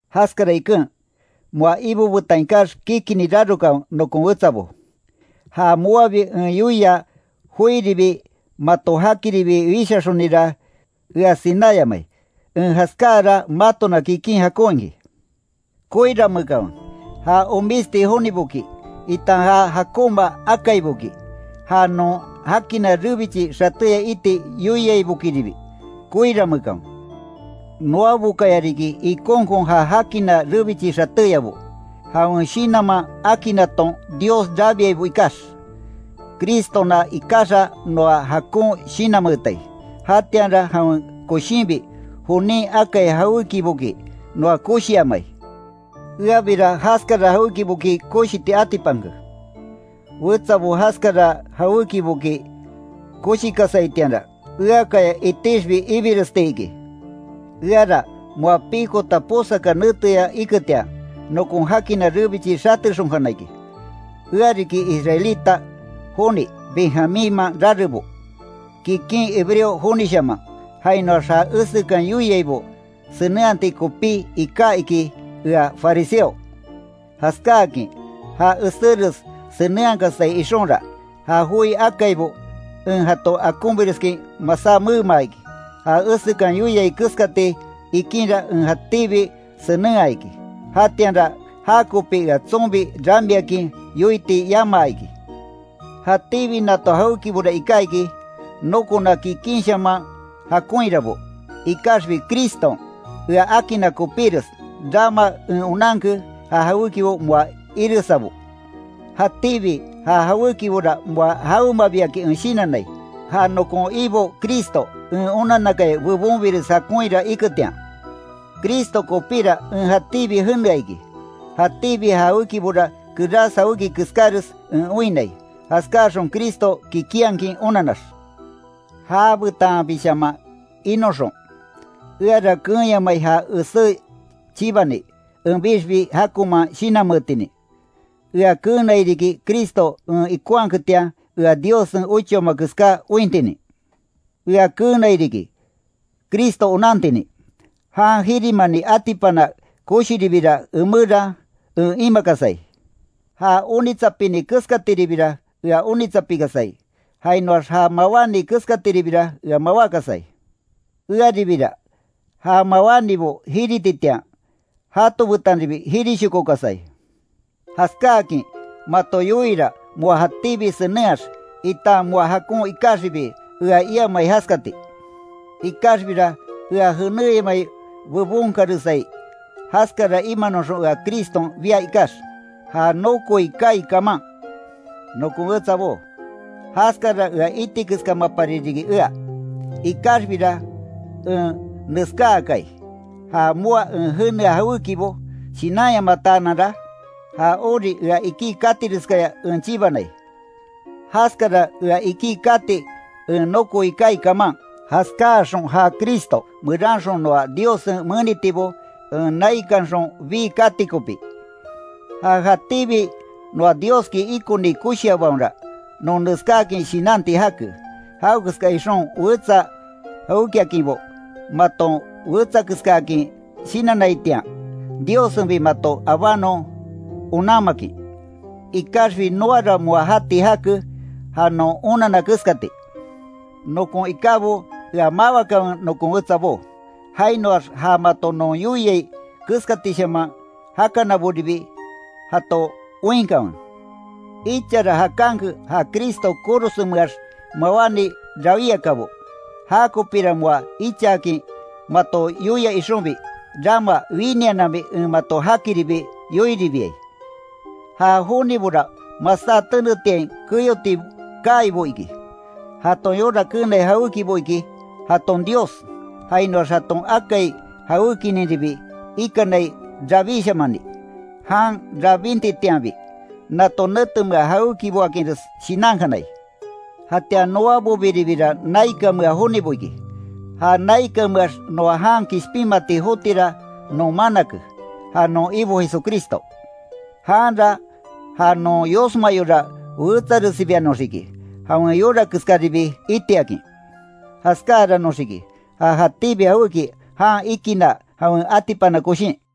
Jaskara iken, moa Ibo betan ikax kikini rarokanwe nokon wetsabo. Ja moabi en yoia joiribi mato jakiribi wishaxonira ea sináyamai, en jaskáara matona kikin jakon iki. Koiranmeekanwe, ja omisti joniboki, itan ja jakonma akaiboki, ja non jakina rebichi xatéya iti yoiaibokiribi, koirameekanwe. Noabokaya riki ikonkon ja jakina rebichi xatéyabo, jawen Shinanman akinnaton Dios rabiaibo ikax. Cristona ikaxa noa jakon shinanmeetai, jatianra jawen koshinbi jonin akai jawékiboki noa koshiamai. Eabira jaskara jawékiboki koshiti atipanke. Wetsabo jaskara jawékiboki koshikasaitianra, eakaya itixbi ibiresti iki. Eara moa pikota posaka neteya iketian, nokon jakina rebichi xatexonkana iki, ea riki israelita joni Benjamínman rarebo, kikin hebreo jonishaman, jainoax ja esekan yoiaibo senenhati kopí iká iki ea fariseo, jaskáakin ja eséres senenhakasai ixonra, ja joi akaibo en jato akonbireskin masá meema iki. Ja esekan yoiai keskati ikinra en jatíbi senenhaa iki, jatianra jakopi ea tsonbi ramiakin yoiti yamaa iki. Jatíbi nato jawékibora iká iki, nokona kikínshaman jakonhirabo, ikaxbi Criston ea akinna kopíres, rama en onanke ja jawékibo moa iresabo. Jatíbi ja jawékibora moa jawemabiakin en shinannai, ja nokon Ibo Cristo en onanakaya bebonbires jakonhira iketian. Cristo kopíra en jatíbi jenea iki, jatíbi ja jawékibora kerás jawéki keskáres en oinnai, jaskáaxon Cristo kikinhakin onanax, jabetanbishaman inoxon. Eara keenyamai ja esé chibani, enbixbi jakonman shinanmeetinin, ea keenai riki Cristo en ikonhaketian, ea Diossen ochaoma keská ointinin. Ea keenai riki Cristo onantinin, jan jirimani atipana koshiribira emeran en imakasai. Já onitsapini keskatiribira ea onitsapikasai, jainoax ja mawáni keskatiribira ea mawákasai, earibira ja mawánibo jirititian, jato betanribi jirishokokasai. Jaskáakin mato yoiira moa jatíbi senenhax, itan moa jakon ikaxibi ea iamai jaskati. Ikaxbira ea jenéyamai bebon karesai, jaskara imanoxon ea Criston bia ikax, ja nokoi kaai kaman. Nokon wetsabó, jaskara ea iti keskámapari riki ea, ikaxbira en neskaakai, ja moa en jenea jawékibo shinanyamataananra, ja ori ea ikí katireskaya en chibanai, jaskara ea ikí kati en nokoi kaai kaman, jaskáaxon ja Cristo meranxon noa Diossen menitibo en naikanxon bii kati kopí. Ja jatíbi noa Dioski ikoni koshiabaonra, non neskáakin shinanti jake. Jawekeska ixon wetsa jawékiainbo maton wetsakeskaakin shinannaitian, Diossenbi mato abanon onanmakin. Ikaxbi noara moa jati jake, ja non onanna keskati. Nokon ikábo ea mawakanwe nokon wetsabó. Jainoax ja mato non yoiai keskatishaman jakanaboribi jato oinkanwe. Ichara jakanke ja Cristo korosenmeax mawáni rawíakabo, jakopira moa ichaakin mato yoia ixonbi, rama winiananbi en mato jakiribi yoiribiai. Ja jonibora masá tenetiain keyoti kaibo iki. Jaton yora keenai jawékibo iki, jaton dios, jainoax jaton akai jawékininribi ikanai rabíshamani, jan rabintitianbi. Nato netemea jawékiboakinres shinankanai. Jatian noabobiribira naikanmea jonibo iki. Ja naikanmeax noa jan kishpinmati jotira non manake, ja non Ibo Jesucristo. Janra ja non yosma yora wetsaresibianoxiki, jawen yora keskáribi itiakin. Jaskáaranoxiki, ja jatíbi jawéki jan ikinna jawen atipana koshin.